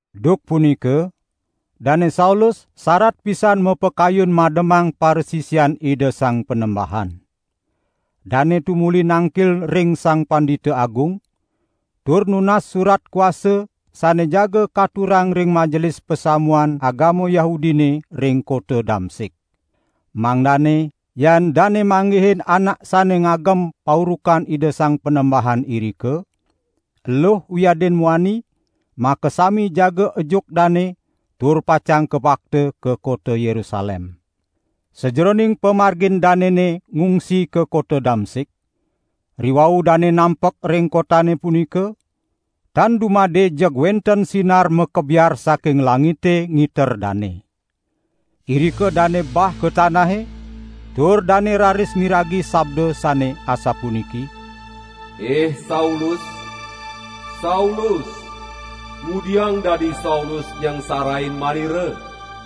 Duk punika Dane Saulus sarat pisan mapakayun mademang parasisian Ida Sang Panembahan. Dane tumuli nangkil ring Sang Pandita Agung, tur nunas surat kuasa sane jaga katurang ring majelis pasamuan agama Yahudine ring kota Damsik. Mangdane yan dane manggihin anak sane ngagem paurukan Ida Sang Panembahan irika, eluh wiadin muani, makasami jaga ejuk dane tur pacang kabakta ka kota Yerusalem. Sajeroning pamargin danene ngungsi ka kota Damsik, riwau dane nampek ring kotane punika, tan dumade jeg wenten sinar makebiar saking langite ngiter dane. Irika dane bah ka tanahe tur dane raris miragi sabda sane asapuniki: "Ih Saulus, Saulus, ngudiang dadi Saulus nyangsarain Manira?"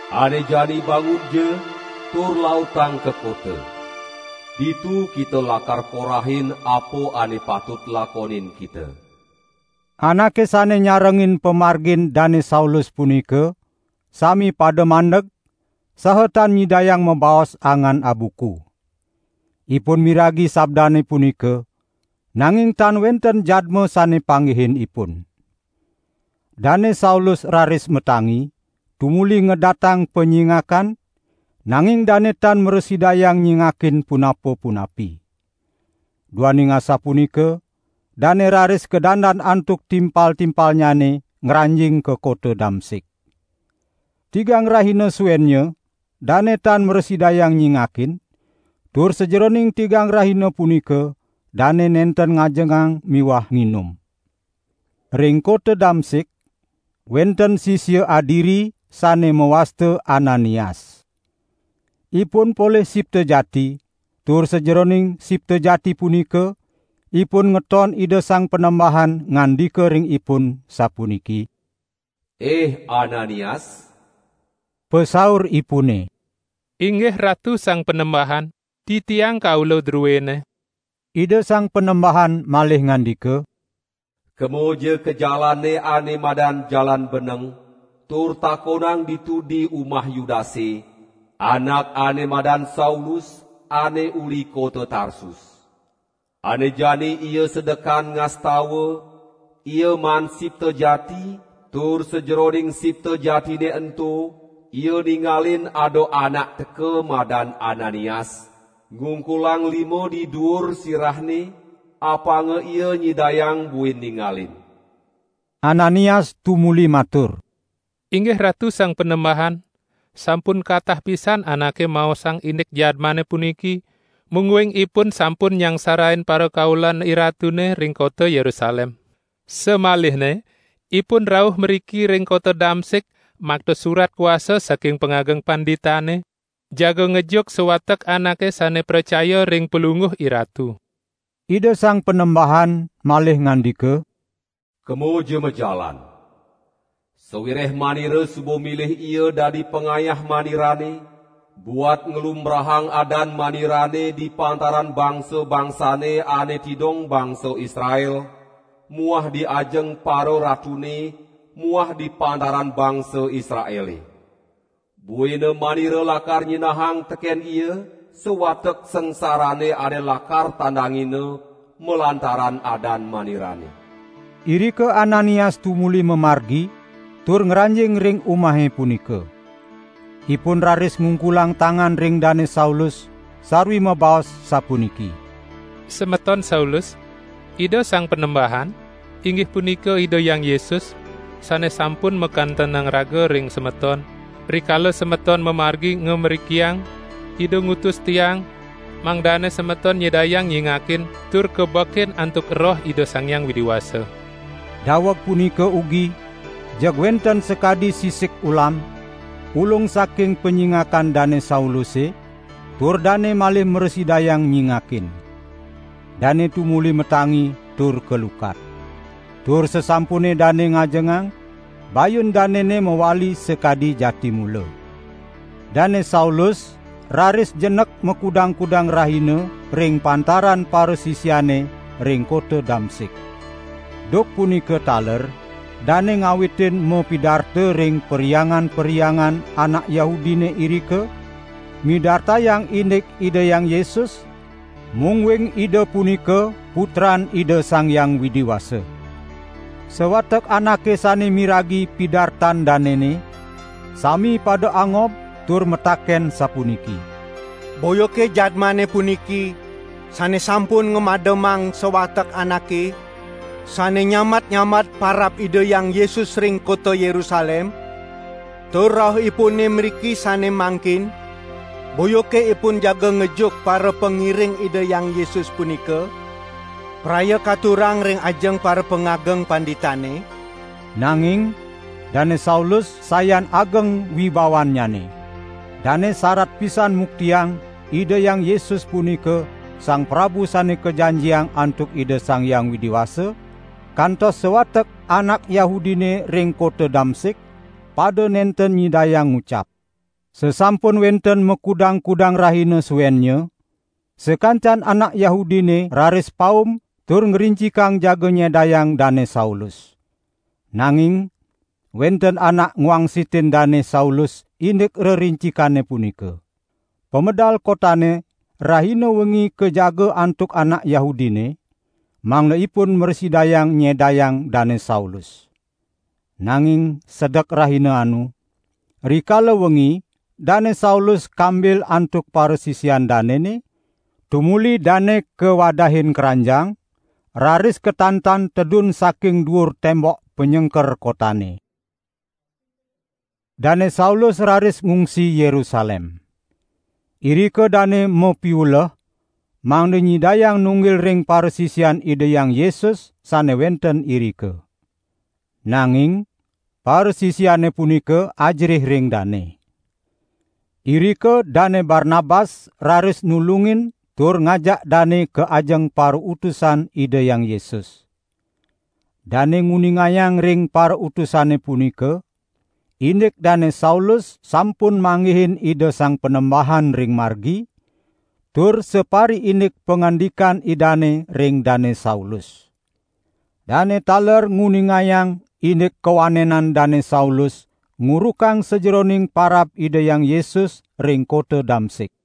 Ane jani bangunja, tur lautang ka kota. Ditu kita lakar korahin, apa ane patut lakonin kita." Anake sane nyarengin pamargin Dane Saulus punika, sami pada mandeg, saha tan nyidayang mabaos angan abuku. Ipun miragi sabdane punika, nanging tan wenten jadma sane panggihin ipun. Dane Saulus raris matangi, tumuli ngedatang panyingakan, nanging dane tan mrasidayang nyingakin punapa-punapi. Duaning asapunika, dane raris kadandan antuk timpal-timpalnyane ngranjing ka kota Damsik. Tigang rahina suennya dane tan mrasidayang nyingakin, tur sajeroning tigang rahina punika dane nenten ngajengang miwah nginum. Ring kota Damsik, wenten sisia adiri sane mawasta Ananias. Ipun polih sipta jati, tur sajeroning sipta jati punika ipun ngeton Ida Sang Panembahan ngandika ring ipun sapuniki: "Ih Ananias!" Pasauripune: "Inggih Ratu Sang Panembahan, titiang kaula druene." Ida Sang Panembahan malih ngandika: "Kemaja ka jalane ane madan Jalan Beneng, tur takonang ditu di umah Yudase, anak ane madan Saulus, ane uli kota Tarsus. Ane jani ia sedekan ngastawa, ia maan sipta jati tur sajeroning sipta jatine ento ia ningalin ada anak teka madan Ananias, ngungkulang lima di duur sirahne, apanga ia nyidayang buin ningalin." Ananias tumuli matur: "Inggih Ratu Sang Panembahan, sampun katah pisan anake maosang indik jadmane puniki, mungguing ipun sampun nyangsarain parakaulan IRatune ring kota Yerusalem. Samalihne ipun rauh mriki ring kota Damsik makta surat kuasa saking pangageng panditane jaga ngejuk sawatek anake sane pracaya ring Palungguh IRatu." Ida Sang Panembahan malih ngandika: "Kemaja majalan! Sawireh Manira suba milih ia dadi pangayah Manirane, buat nglumbrahang adan Manirane di pantaran bangsa-bangsane ane tidong bangsa Israel muah di ajeng pararatune muah di pantaran bangsa Israele. Buina Manira lakar nyinahang teken ia, sawatek sangsarane ane lakar tandangina malantaran adan Manirane." Irika Ananias tumuli mamargi, tur ngranjing ring umahe punika. Ipun raris ngungkulang tangan ring Dane Saulus, sarwi mabaos sapuniki: "Semeton Saulus, Ida Sang Panembahan, inggih punika Ida Hyang Yesus, sane sampun makantenang raga ring semeton, rikala semeton mamargi ngamrikiang, Ida ngutus tiang, mangdane semeton nyidayang nyingakin tur kabekin antuk Roh Ida Sang Hyang Widi Wasa." Daweg punika ugi jeg wenten sakadi sisik ulam, ulung saking panyingakan Dane Sauluse tur dane malih mrasidayang nyingakin. Dane tumuli matangi tur kalukat. Tur sasampune dane ngajengang, bayun danene mawali sakadi jati mula. Dane Saulus raris jenek makudang-kudang rahina ring pantaran parasisiane ring kota Damsik. Duk punika taler dane ngawitin mapidarta ring perhyangan-perhyangan anak Yahudine irika, midartayang indik Ida Hyang Yesus, mungguing Ida punika Putran Ida Sang Hyang Widi Wasa. Sawatek anake sane miragi pidartan danene, sami pada angob tur mataken sapuniki: "Boyake jadmane puniki sane sampun ngamademang sawatek anake sane nyambat-nyambat parab Ida Hyang Yesus ring kota Yerusalem? Tur rauhipune mriki sane mangkin, boyake ipun jaga ngejuk parapangiring Ida Hyang Yesus punika, praya katurang ring ajeng parapangageng panditane?" Nanging Dane Saulus sayan ageng wibawannyane. Dane sarat pisan muktiang Ida Hyang Yesus punika Sang Prabu Sane Kajanjiang antuk Ida Sang Hyang Widi Wasa, kantos sawatek anak Yahudine ring kota Damsik pada nenten nyidayang ngucap. Sasampune wenten makudang-kudang rahina suennya, sakancan anak Yahudine raris paum tur ngrincikang jaga nyedayang Dane Saulus. Nanging wenten anak ngwangsitin Dane Saulus indik rerincikane punika. Pamedal kotane rahina wengi kajaga antuk anak Yahudine, mangda ipun mrasidayang nyedayang Dane Saulus. Nanging sedek rahina anu, rikala wengi Dane Saulus kambil antuk parasisian danene, tumuli dane kawadahin kranjang raris katantan tedun saking duur tembok panyengker kotane. Dane Saulus raris ngungsi Yerusalem. Irika dane mapiuleh mangda nyidayang nunggil ring parasisian Ida Hyang Yesus sane wenten irika. Nanging parasisiane punika ajerih ring dane. Irika Dane Barnabas raris nulungin tur ngajak dane ka ajeng parautusan Ida Hyang Yesus. Dane nguningayang ring parautusane punika, indik Dane Saulus sampun manggihin Ida Sang Panembahan ring margi, tur sapariindik pangandikan Idane ring Dane Saulus. Dane taler nguningayang indik kawanenan Dane Saulus ngurukang sajeroning parab Ida Hyang Yesus ring kota Damsik.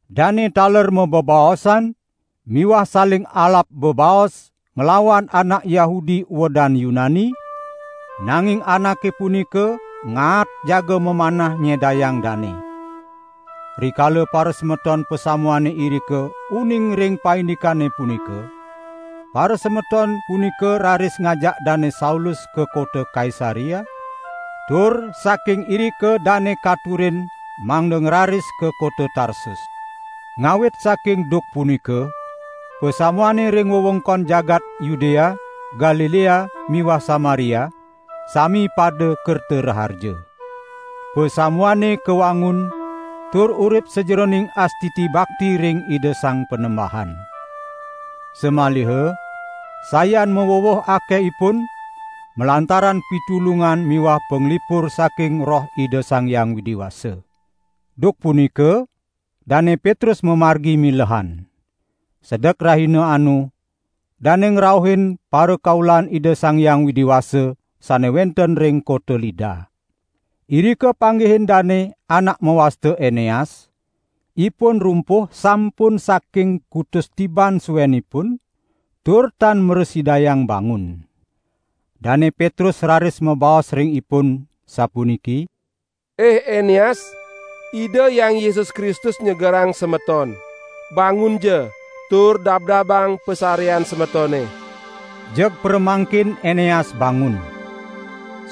Dane taler mabebaosan miwah saling alap bebaos nglawan anak Yahudi uedan Yunani, nanging anake punika ngaat jaga mamanah nyedayang dane. Rikala parasemeton pasamuane irika uning ring paindikane punika, parasemeton punika raris ngajak Dane Saulus ka kota Kaisarea, tur saking irika dane katurin mangda ngraris ka kota Tarsus. Ngawit saking duk punika pasamuane ring wewengkon jagat Yudea, Galilea miwah Samaria sami pada kerta raharja. Pasamuane kawangun tur urip sajeroning astiti bakti ring Ida Sang Panembahan. Samaliha sayan maweweh akehipun, malantaran pitulungan miwah panglipur saking Roh Ida Sang Hyang Widi Wasa. Duk punika Dane Petrus mamargi milehan. Sedek rahina anu, dane ngrauhin parakaulan Ida Sang Hyang Widi Wasa sane wenten ring kota Lida. Irika panggihin dane anak mawasta Eneas, ipun rumpuh sampun saking kutus tiban suenipun tur tan mrasidayang bangun. Dane Petrus raris mabaos ring ipun, sapuniki: "Ih Eneas, Ida Hyang Yesus Kristus nyegerang semeton. Bangunja tur dabdabang pasarean semetone." Jeg pramangkin Eneas bangun.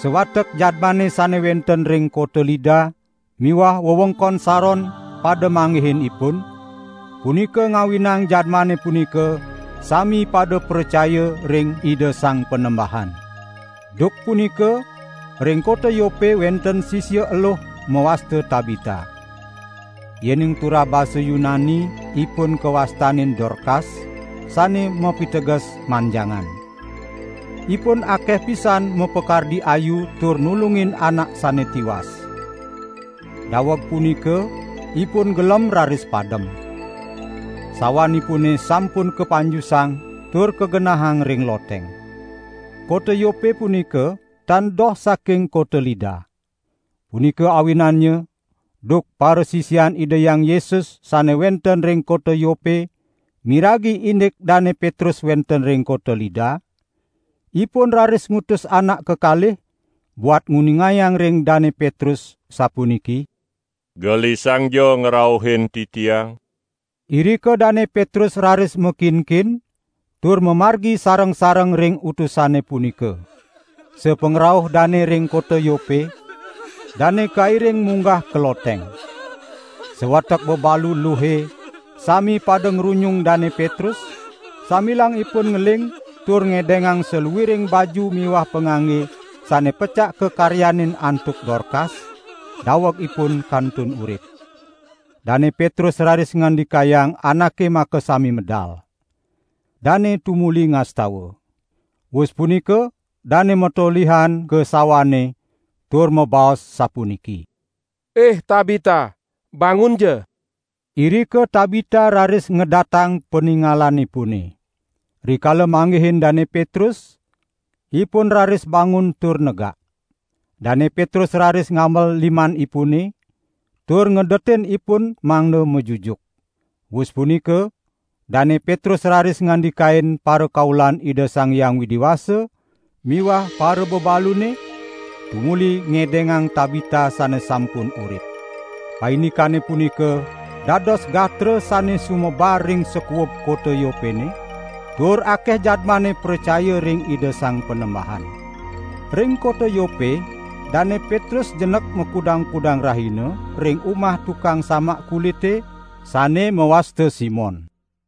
Sawatek jadmane sane wenten ring kota Lida miwah wewengkon Saron pada manggihin ipun, punika ngawinang jadmane punika sami pada pracaya ring Ida Sang Panembahan. Duk punika ring kota Yope wenten sisia eluh mawasta Tabita. (Yening turah basa Yunani ipun kawastanin: Dorkas, sane mapiteges: manjangan.) Ipun akeh pisan mapakardi ayu tur nulungin anak sane tiwas. Daweg punika ipun gelem raris padem. Sawanipune sampun kapanjusang tur kagenahang ring loteng. Kota Yope punika tan doh saking kota Lida. Punika awinannya duk parasisian Ida Hyang Yesus sane wenten ring kota Yope miragi indik Dane Petrus wenten ring kota Lida, ipun raris ngutus anak kekalih, buat nguningayang ring Dane Petrus, asapuniki: "Gelisangja ngrauhin titiang." Irika Dane Petrus raris makinkin tur mamargi sareng-sareng ring utusane punika. Sapangrauh dane ring kota Yope, dane kairing munggah ka loteng. Sawatek bebalu luhe sami pada ngrunyung Dane Petrus, sambilang ipun ngeling tur ngedengang saluiring baju miwah pangangge sane pecak kakaryanin antuk Dorkas, daweg ipun kantun urip. Dane Petrus raris ngandikayang anake makasami medal. Dane tumuli ngastawa. Wus punika dane matolihan ka sawane tur mabaos sapuniki: "Ih Tabita, bangunja!" Irika Tabita raris ngedatang paningalanipune. Rikala manggihin Dane Petrus, ipun raris bangun tur negak. Dane Petrus raris ngambel limanipune tur ngedetin ipun mangda majujuk. Wus punika Dane Petrus raris ngandikain parakaulan Ida Sang Hyang Widi Wasa miwah parabebalune, tumuli ngedengang Tabita sane sampun urip. Paindikane punika dados gatra sane sumebar ring sakuub kota Yopene, tur akeh jadmane pracaya ring Ida Sang Panembahan. Ring kota Yope Dane Petrus jenek makudang-kudang rahina, ring umah tukang samak kulite, sane mawasta Simon.